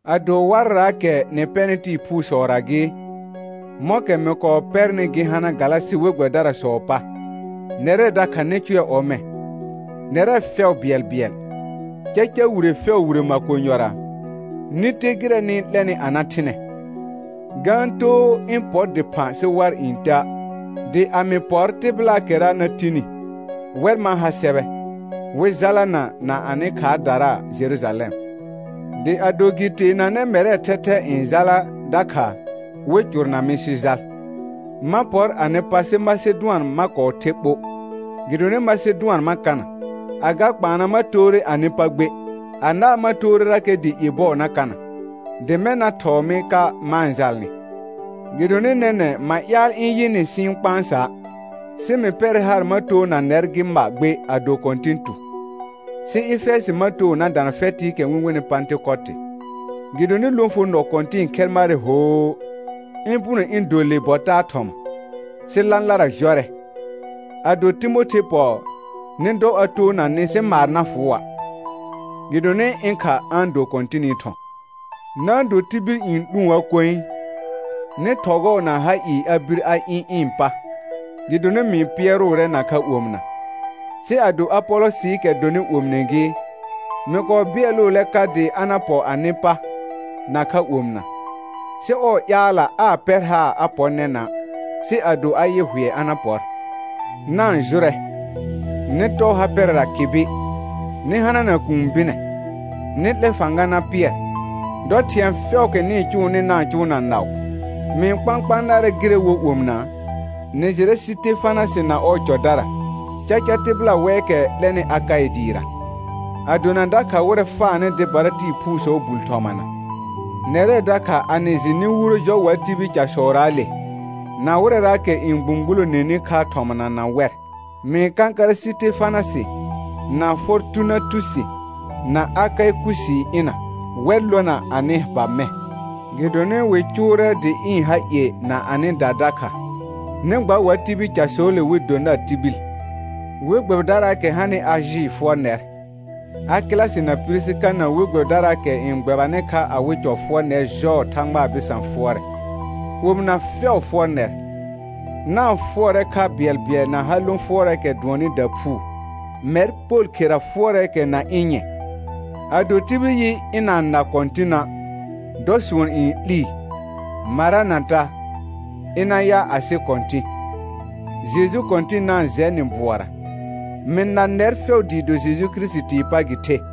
Ado warraakɛ nɩ pɛnɩ tɩɩ phuusɔra gɩ, mɔ̃kɛ mɩ kɔɔ pɛrnɩ gɩ hana Galasɩ we gbɛbɩdarasɔɔ pa, nɛrɛ dakha nɩ cʋɛ ɔmɛ̃. Nɛrɛ fɛʋ bɩɛlbɩɛl, caca wire fɛʋ wire makonyɔra, nɩ te gɩrɛ nɩ-n 'lɛnɩ a na thɩnɛ; ga-n too ɩ̃ pɔ dɩphã sɩ war n tea'. Dɩ a mɩ pɔr tɩbɩlaakɛra na tini, wɛr ma ha sɛbɛ, wɩ jalana na anɩ khaardara Jerujalɛm. Dɩ ado gɩ teenanɛ mɛrɛɛ thɛthɛ n jala dakha, wɩ cʋrna mɩ sɩ jal. Ma pɔr anɩ pa sɩ Masedʋan ma kɔɔ the ɓo, gɩdonɩ Masedʋan ma kana. Agakpaana ma toore anɩ pa gbe, anaa ma toorerakɛ dɩ ie bɔɔ na kana, dɩ mɛ̃ na thɔɔ mɩ ka ma-n jalnɩ. Gɩdonɩ nɛnɛ̃ ma ƴaal ɩ̃ yɩ nɩ sɩ ɩ̃ kpãsa', sɩ mɩ pɛrɛ haar ma toona nɛr gɩ ma gbe ado Kɔ̃tɩn tu. Sɩ Efɛjɩ ma too na dana fɛtɩɩkɛ wɩ-n wenɩ Pãtɩkotɩ, gɩdonɩ lõfonɔ kɔ̃tɩ̃ɩ khɛr marɛ hoo, ɩ̃ puno ɩ̃ do le bɔ taa thɔma, sɩ lãlara jɔrɛ. Ado Timothe pɔ, nɩ dɔ a toona nɩ sɩ maar na fʋʋa', gɩdonɩ ɩ̃ kha a-n do Kɔ̃tɩnɩ thɔ̃. Na-n do tibil n 'lũə koe. Nɩ thɔgɔɔ na ha ɩɩ a bir a ɩ̃ ɩ̃ pa, gɩdonɩ mɩ-n pɩɛrʋʋrɛ nakha omɩna. Sɩ ado Apolɔsɩɩkɛ dɔnɩ omine gɩ, mɩ kɔɔ bɩɛlʋʋlɛ ka dɩ a na pɔ anɩ pa, nakha omɩna, sɩ ɔɔ ƴaalla aa pɛr haar a pɔ nɛnã', sɩ ado a yɩ hʋɛ a na pɔr. Na-n jʋrɛ, nɩ tɔɔ ha pɛrɛra kɩbɩ, nɩ hana kũu bɩnɛ, nɩ 'lɛ fãga na pɩɛr. Dɔ thɩ̃ɛ fɛʋʋkɛ nɩ-n cʋʋnɩ na-n cʋʋ na naʋ. Mɩ-n kpãkpãa narɛ gɩrɛ wo omɩna: Nɩ jɩrɛ Sɩtefanasɩ na ɔɔ cɔdara; caca tɩbɩla wɛɛkɛ 'lɛnɩ Akaɩ dɩɩra, a dona dakha wɩrɛ faanɩ dɩbara tɩɩ phuusɔɔ bul thɔmana. Nɛrɛ dakha a nɩ jɩ nɩ wuro jɔ wa tibil casɔraale, na wɩrɛraakɛ n gbũgbuloneni kha thɔmana na wɛr. Mɩ-n kãkarɛ Sɩtefanasɩ, na Fɔrtunatusi, na Akaɩkusii ɩna, wɛr lona anɩ ba mɛ̃. Gɩdonɩ wɩ cʋʋrɛ dɩ ɩ̃ ha ie na anɩda dakha; nɩ gba wa tibil casɔɔle wɩ do nar tibil. We gbɛbɩdaraakɛ hanɩ Ajɩ fʋɔr nɛr. Akɩlasɩ na Pirisika na we gbɛbɩdaraakɛ n gbɛbanɩ kha awɩ cɔ fʋɔr nɛr jɔɔ Thãgba bɩsã fʋɔrɛ. Omɩna fɛʋ fʋɔr nɛr. Na-n fʋɔrɛ kha bɩɛlbɩɛl na ha lõ fʋɔrɛɛkɛ dʋɔnnɩ daphuu. Mɛr Pol khera fʋɔrɛɛkɛ na ɩ̃ nyɛ̃. Ado tibil yɩ, ɩna-n na Kɔ̃tɩna', dɔ sʋɔn n 'lii. Maranata: Ɩna ya asɩ Kɔ̃tɩ̃. Jeju Kɔ̃tɩn na-n jɛ nɩ bʋɔra. Mɩ na nɛr fɛʋ dɩɩ do Jeju Kirisitii pa gɩ the.